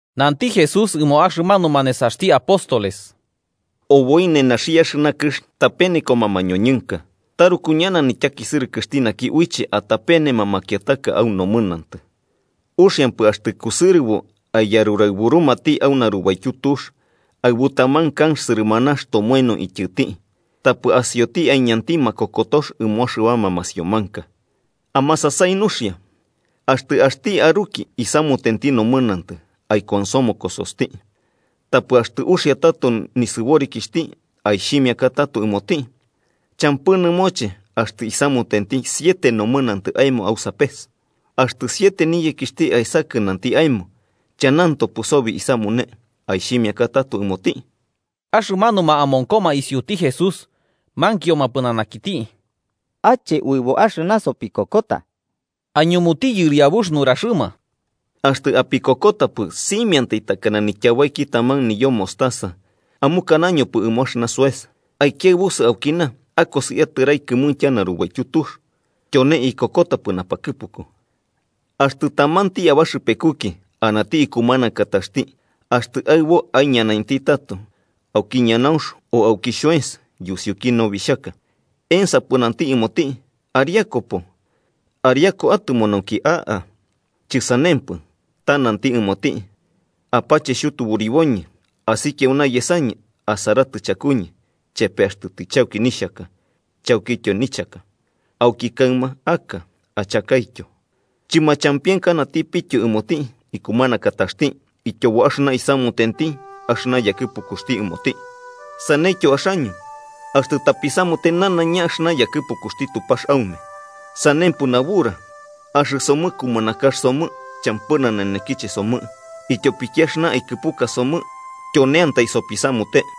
Nanti Jesús ɨmo axɨmanuma nesaxti apóstoles: “Oboi nenaxi axɨna kɨx tapenekoma mañoñɨnka. ¡Taruku ñana nityakisɨrɨkɨxti naki uiche atapenema makiataka au nomɨnantɨ! Uxiampɨ axtɨ kusɨrɨbo aiyaruraɨburumati au narubaityu tux aɨbu taman kanx sɨrɨmanax tomoeno ityɨti, tapɨ asioti aiñanti makokotox ɨmo axɨbama masiomanka. ¡Amasasai nuxia! “Axtɨ axti aruki isamutenti nomɨnantɨ, aikuansomokosoxti. Tapɨ axtɨ uxia tato nisɨborikixhti, aixhimiaka tato ɨmoti. Champɨ nɨmoche axtɨ isamutenti siete nomɨnantɨ aemo au sapes, axtɨ siete niyekixhti aesakɨ nanti aemo: ‘Chanantopɨ sobi isamune’, aixhimiaka tato ɨmoti.” Axɨmanuma amonkoma isiuti Jesús mankioma pɨnanakiti: –Ache uɨbo axɨna sopikokota. Aiñumuti Yɨriabux nuraxɨma: –Axtɨ apikokotapɨ, simiantai takana nityabaiki taman niyo mostaza, amukanañopɨ ɨmo axɨna soes: ‘Aikiaɨbusɨ aukina akosi atɨrai kɨmuintya narubaityu tux’, tyone ikokotapɨ napakɨpuku. “Axtɨ tamanti abaxɨpekuki anati ikumanakataxti axtɨ aɨbo aiñanainti tato auki ñanaunx o auki xhoens yusiuki nobixhaka, ¿ensapɨ nanti ɨmoti: ‘Ariakupo ariaku atɨmo nauki aka’? Chɨsanempɨ, ta nanti ɨmoti: ‘Apache xhutuburiboñɨ, asikia auna yesañɨ asaratɨ chakuñɨ chepe axtɨ tɨchauki nixhaka chaukityo nichaka. Auki kaɨma a'aka achakaityo.’ Chɨmachampienkanatipityo ɨmoti ikumanakataxti ityobo axɨna isamutenti axɨna yakɨpukuxti ɨmoti. Saneityo axaño, axtɨ tapisamute nanaiña axɨna yakɨpukuxti Tupax aume, sanempɨ nabura: ‘Axɨsomɨ kumanakax somɨ champɨ nanenekiche somɨ, ityopiki axɨna aikɨpuka somɨ tyoneantai sopisamute.’”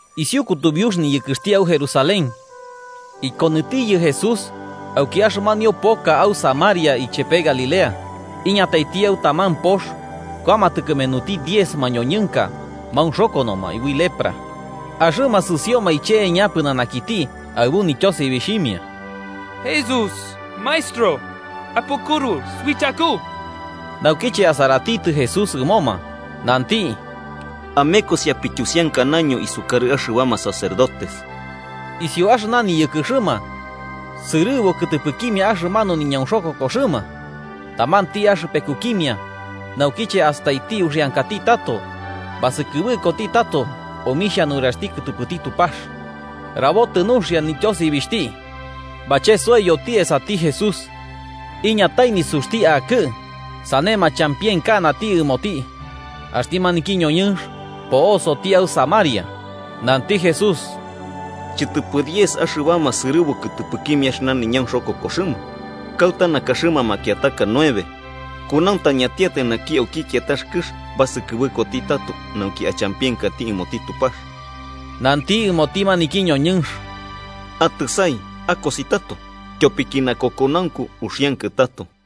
Isiu kutubiux niyɨkɨxti au Jerusalén, ikonɨtiyɨ Jesús auki axɨmanio poka au Samaria ichepe Galilea. Iñataiti au taman pox, kuamatɨ kɨmenuti diez mañoñɨnka maunxokonoma ui lepra, axɨma sɨsioma iche'eña pɨnanakiti aɨbu nityosibixhimia: –¡Jesús, Maestro, apukɨru suichaku! Naukiche asaratitɨ Jesús ɨmoma, nanti: –Amekosi apityusiankanaño isukarɨ axɨbama sacerdotes. Isiu axɨna niyɨkɨxɨma, sɨrɨbu kɨtɨpɨkimia axɨmanu niñaunxokokoxɨma. Tamanti axɨpekukimia, naukiche astaiti uxiankati tato, basɨkɨbɨkoti tato omixha nuraxti kɨtɨpɨti Tupax rabotɨ nuxia nityosibixhti, bachesoiyoti esati Jesús, iñatai nisuxti akɨ'ɨ sane machampienkanati ɨmoti. Axti naki ñoñɨnx po'osoti au Samaria. Nanti Jesús: –¿Chɨtɨpɨ diez axɨbama sɨrɨbu kɨtɨpɨkimia axɨna niñaunxokokoxɨma? ¿Kauta nakaxɨma makiataka nueve? ¿Kunauntañatiatai naki auki kiatax kɨx basɨkɨbɨkoti tato nauki achampienkati ɨmoti Tupax? Nanti ɨmoti maniki ñoñɨnx: –Atɨsai akosi tato. Tyopiki nakokonaunku uxiankɨ tato.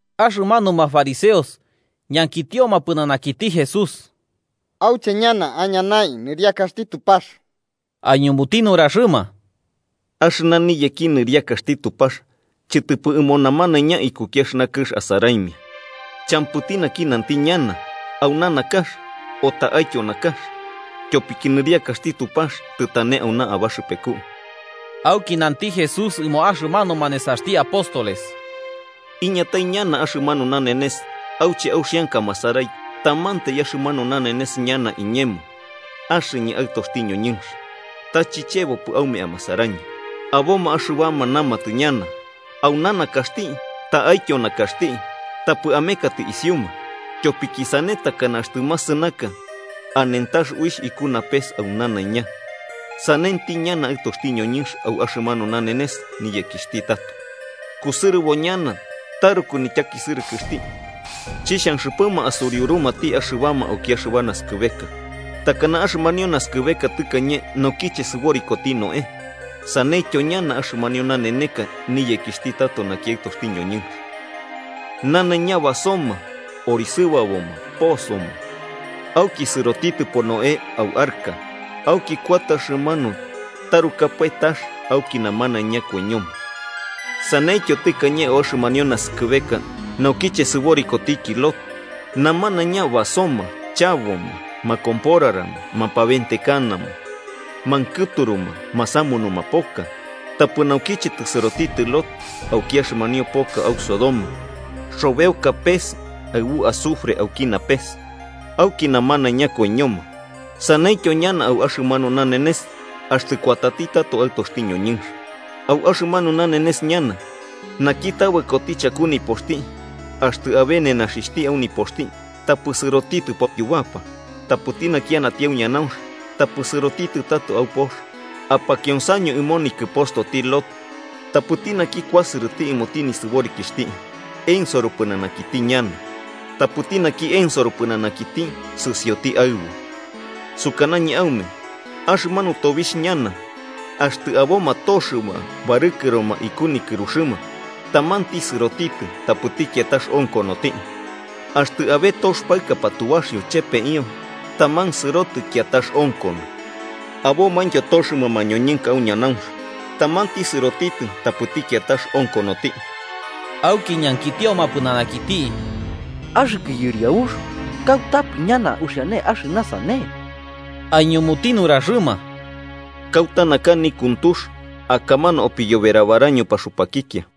Axɨmanuma fariseos ñankitioma pɨnanakiti Jesús auche ñana aiñanai nɨriakaxti Tupax, aiñumuti nuraxɨma: –Axɨna niyeki nɨriakaxti Tupax chɨtɨpɨ ɨmo namanaiña ikuki axɨna kɨx asaraimia. Champɨti naki nanti ñana: ‘Auna nakax’, o ‘Ta'aityo nakax.’ Tyopiki nɨriakaxti Tupax tɨtane auna abaxɨpeku. Auki nanti Jesús ɨmo axɨmanuma nesaxti apóstoles: –Iñatai ñana axɨmanu nanenes auche auxianka amasarai tamantai axɨmanu nanenes ñana iñemo axɨñɨ Aɨtoxti ñoñɨnx, ta chichebopɨ aume amasarañɨ. Aboma axɨbama namatɨ ñana: ‘Auna nakaxti’, ‘ta'aityo nakaxti.’ Tapɨ amekatɨ isiuma. Tyopiki sane takana axtɨ masɨnaka, anentax uixh, iku napes au nanaiña, sanenti ñana Aɨtoxti ñoñɨnx au axɨmanu nanenes niyekixhti tato. Kusɨrɨbo ñana taruku nityakisɨrɨkɨxti chixhanxɨpɨma asuriurumati axɨbama auki axɨba naskɨbeka. Takana axɨmanio naskɨbeka tɨkañe naukiche sɨborikotiki Noé, saneityo ñana axɨmanio naeneka niyekixhti tato naki Aɨtoxti ñoñɨnx. Namanaiña basoma orisɨbaboma posoma, auki sɨrotitɨpo Noé au arca, auki kuatɨ axɨmanu tarukapae tax auki namanaiña koiñoma. Saneityo tɨkañe au axɨmanio naskɨbeka naukiche sɨborikotiki Lot: namanaiña basoma chaboma, makomporarama mapaventekanama, mankɨturuma masamunuma poka. Tapɨ naukiche tɨsɨrotitɨ Lot auki axɨmanio poka au Sodoma, xobeoka auki napes pes aɨbu azufre, auki namanaiña koiñoma. Saneityo ñana au axɨmanu nanenes axtɨ kuatati tato Aɨtoxti ñoñɨnx. “Au axɨmanu nanenes ñana, naki tabɨkoti chaku nipoxti axtɨ abe nenaxixhti au nipoxti, tapɨ sɨrotitɨpo yubapa. Tapɨti naki anati au ñanaunx, tapɨ sɨrotitɨ tato au pox. Apakionsaño ɨmo nikɨpostoti Lot. Tapɨti naki kuasɨrɨ ɨmoti nisɨborikixhti, ensoro pɨnanakiti ñana. Tapɨti naki ensoro pɨnanakiti, sɨsioti aɨbu. “Sukanañɨ aume axɨmanu tobixh ñana, axtɨ aboma toxɨma barɨkɨroma iku nikɨruxɨma, tamanti sɨrotitɨ tapɨti kiatax onkonoti. Axtɨ abe tox paɨka patubaxio chepeio, taman sɨrotɨ kiatax onkono.” Abomaintyo toxɨma mañoñɨnka au ñanaunx. Tamanti sɨrotitɨ tapɨti kiatax onkonoti. Auki ñankitioma pɨnanakiti: –¿Axɨkɨ Yɨriabux, kautapɨ ñana uxiane axɨna sane? Aiñumuti nuraxɨma: –Kauta naka nikuntux, akamanu opiyoberabaraño paxupakikia.